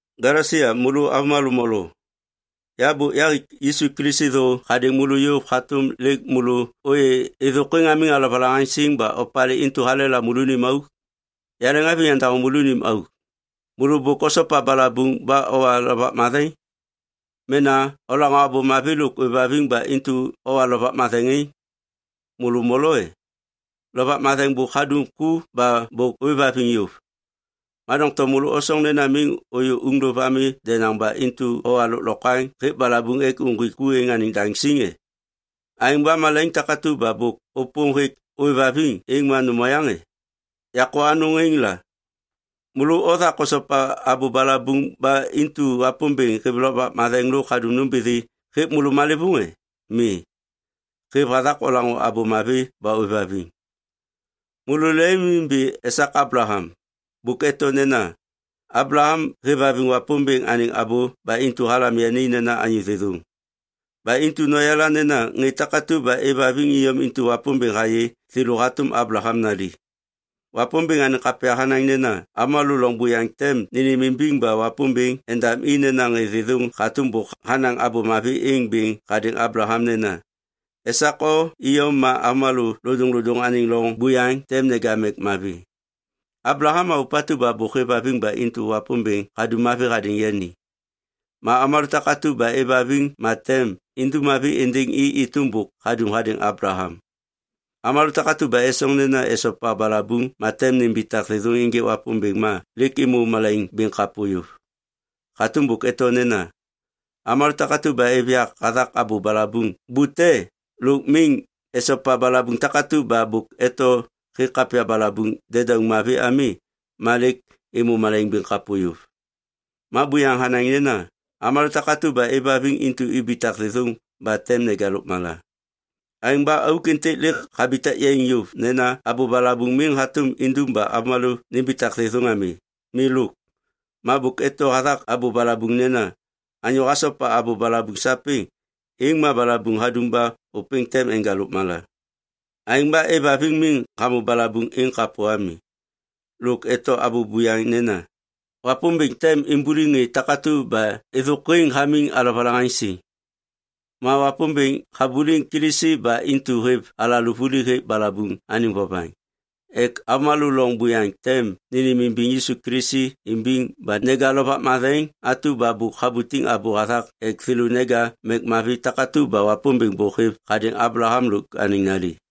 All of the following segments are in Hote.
Galesia môlô avômalô molo. Ya bôk yahik Yisu Kilisi thô hadêŋ môlô yôv hatôm lêk môlô ôyê êthôkwêŋ hamiŋ alovalaŋaŋsiŋ ba opalê intu halela môlônim auk? Yaleŋhaviŋ yandaŋô môlônim auk. Môlô bôk osopa balabuŋ ba owa Lovak Matheŋ? Mena olaŋô Abô Mavi lôk ôêvhaviŋ ba intu owa Lovak Matheŋ êŋ? Môlô molo e? Lovak Matheŋ bôk hadum ku ba bôk ôêvhaviŋ yôv. Ma doŋtom môlô osoŋ nena miŋ ôyô uŋlôv ami denaŋ ba intu owa lôklokwaŋ hêk balabuŋ ek uŋgwik ku êŋ daŋ siŋ e? Aêŋ ba malaiŋ takatu ba bôk ôpôm hêk ôêvhaviŋ êŋ ma nôm oyaŋ e? Yakô anôŋ êŋ la. Môlô othak osopa abô balabuŋ ba intu Wapômbêŋ hêv Lovak Matheŋ lôk hadum nômbithi hêk môlô malêvôŋ e? Mi. Hêv hathak olaŋô Abô Mavi ba ôêvhaviŋ. Môlô lemimimbi esak Ablaham. Bôk eto nena, “Ablaham hêvhaviŋ Wapômbêŋ anêŋ abô ba intu halam yani nena anyô thêthôŋ.” Ba intu noyala nena ŋê takatu ba êvhaviŋ iyom intu Wapômbêŋ hayê thêlô hatôm Ablaham nali. Wapômbêŋ anêŋ kapya hanaŋ nena avômalô loŋ buyaŋ tem nênêmimbiŋ ba Wapômbêŋ endam i nena ŋê thêthôŋ hatôm bôk hanaŋ Abô Mavi êŋ bêŋ hadêŋ Ablaham nena, “Esak o iyom ma avômalô lodôŋlodôŋ anêŋ loŋ buyaŋ tem neja mek mavi.” Ablaham ma ôpatu ba bôk hêvhaviŋ ba intu Wapômbêŋ hadum mavi hadêŋ yani. Ma avômalô takatu ba êvhaviŋ ma tem indum mavi êndêŋ i êtôm bôk hadum hadêŋ Ablaham. Avômalô takatu ba esoŋ nena esopa balabuŋ ma tem nimbitak thêthôŋ ênjêk Wapômbêŋ ma lêk êmô malaiŋ bêŋ kapô yôv. Hatôm bôk eto nena, “Avômalô takatu ba êv yak hathak abô balabuŋ bute lôk miŋ esopa balabuŋ takatu ba bôk eto hêk kapya balabuŋ dedauŋ mavi ami ma lêk êmô malaiŋ bêŋ kapô yôv.” Ma buyaŋ hanaŋ nena, “Avômalô takatu ba êvhaviŋ intu ibitak thêthôŋ ba tem neja lôkmala.” Aêŋ ba auk êntêk lêk habitak yaiŋ yôv nena abô balabuŋ miŋ hatôm indum ba avômalô nimbitak thêthôŋ ami. Milôk. Ma bôk eto hathak abô balabuŋ nena, “Anyô hasopa abô balabuŋ sapêŋ, êŋ ma balabuŋ hadum ba ôpêŋ tem enja lôkmala.” Aêŋ ba êvhaviŋ miŋ hamô balabuŋ êŋ kapô ami. Lôk eto abô buyaŋ nena, “Wapômbêŋ tem imbuliŋ ŋê takatu ba êthôkwêŋ hamiŋ alovalaŋaŋsiŋ.” Ma Wapômbêŋ habuliŋ Kilisi ba intu hêv alalô vuli hêk balabuŋ anêŋ vovaŋ ek avômalô loŋ buyaŋ tem nênêmimbiŋ Yisu Kilisi imbiŋ ba neja Lovak Matheŋ atu ba bôk habutiŋ abô hathak ek thêlô neja mek mavi takatu ba Wapômbêŋ bôk hêv hadêŋ Ablaham lôk anêŋ nali.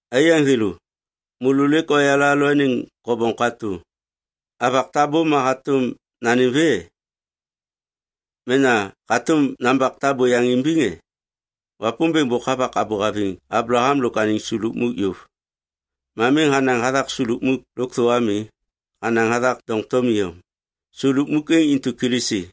Aiyaŋ thêlô, môlô lêk oyala alalôaniŋ kobom katô. Avak tabô ma hatôm nanêm vê, e? Mena hatôm nambak tabô yaŋ imbiŋ e? Wapômbêŋ bôk havak abô haviŋ Ablaham lôk anêŋ su lukmuk yôv. Ma miŋ hanaŋ hathak su lukmuk lôkthô ami. Hanaŋ hathak doŋtom iyom. Su lukmuk êŋ intu Kilisi.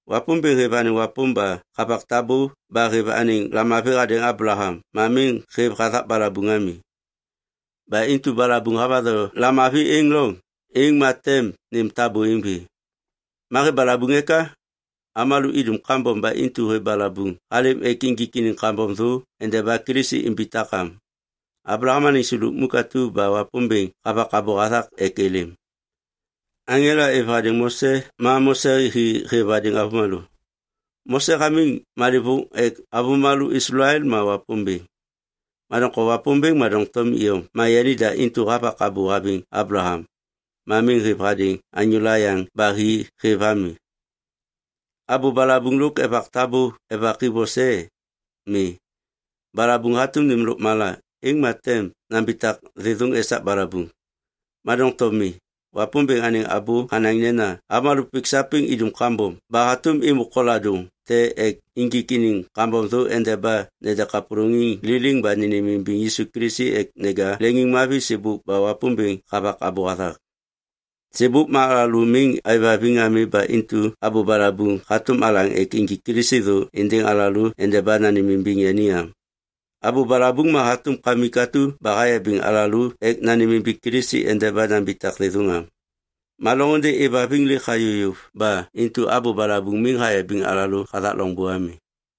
Wapômbêŋ hêv anêŋ wapôm ba havak tabô ba hêv anêŋ lamavi hadêŋ Ablaham ma miŋ hêv hathak balabuŋ ami. Ba intu balabuŋ havatho lamavi êŋ loŋ, êŋ ma tem nêm tabô êŋ vê. Ma hêv balabuŋ eka? Avômalô idum kambom ba intu hêv balabuŋ halêm ek injik iniŋ kambom thô endeba Kilisi imbitak am, Ablaham anêŋ su lukmuk atu ba Wapômbêŋ havak abô hathak ek êlêm. Aŋela êv hadêŋ Mose ma Mose hi hêv hadêŋ avômalô. Mose hamiŋ malêvôŋ ek avômalô Islael ma Wapômbêŋ. Ma doŋtom Wapômbêŋ ma doŋtom iyom ma yanida intu havak abô haviŋ Ablaham, ma miŋ hêv hadêŋ anyôla yaŋ ba hi hêv ami. Abô balabuŋ lôk evak tabô evaki vose e? Mi. Balabuŋ hatôm nêm lôkmala, êŋ ma tem nambitak thêthôŋ esak balabuŋ. Ma doŋtom mi. Wapômbêŋ anêŋ abô hanaŋ nena avômalô pik sapêŋ idum kambom ba hatôm êmô koladôŋ te ek injik iniŋ kambom thô endeba nede kapôlôŋiŋ liliŋ ba nênêmimbiŋ Yisu Kilisi ek neja leŋiŋmavi sêbôk ba Wapômbêŋ havak abô hathak. Sêbôk ma alalô miŋ aêvhaviŋ ami ba intu abô balabuŋ hatôm alaŋ ek injik Kilisi thô êndêŋ alalô endeba nanêmimbiŋ yani am. Abô balabuŋ ma hatôm kamik atu ba hayabiŋ alalô ek nanêmimbiŋ Kilisi endeba nambitak thêthôŋ am. Ma loŋôndê êvhaviŋ lêk hayô yôv ba intu abô balabuŋ miŋ hayabiŋ alalô hathak loŋbô ami.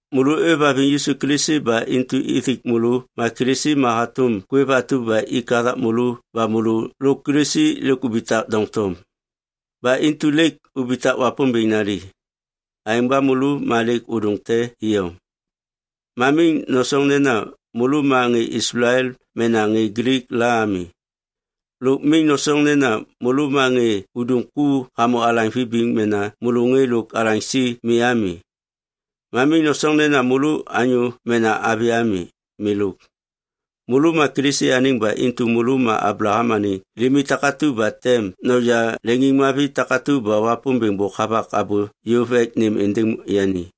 Môlô ôêvhaviŋ Yisu Kilisi ba intu ithik môlô ma Kilisi ma hatôm kwêv atu ba ik hathak môlô ba môlô lôk Kilisi lêk ubitak doŋtom. Ba intu lêk ubitak Wapômbêŋ nali. Aêŋ ba môlô ma lêk ôdôŋ te iyom. Ma miŋ nosoŋ nena môlô ma ŋê Islael mena ŋê Glik la ami. Lôk miŋ nosoŋ nena môlô ma ŋê udum ku hamô alaŋ vibiŋ mena môlô ŋê lôk alaŋsi mi ami. Ma miŋ nosoŋ nena môlô anyô mena avi ami. Milôk. Môlô ma Kilisi anêŋ ba intu môlô ma Ablaham anêŋ limi takatu ba tem noja leŋiŋmavi takatu ba Wapômbêŋ bôk havak abô yôv ek nêm êndêŋ yani.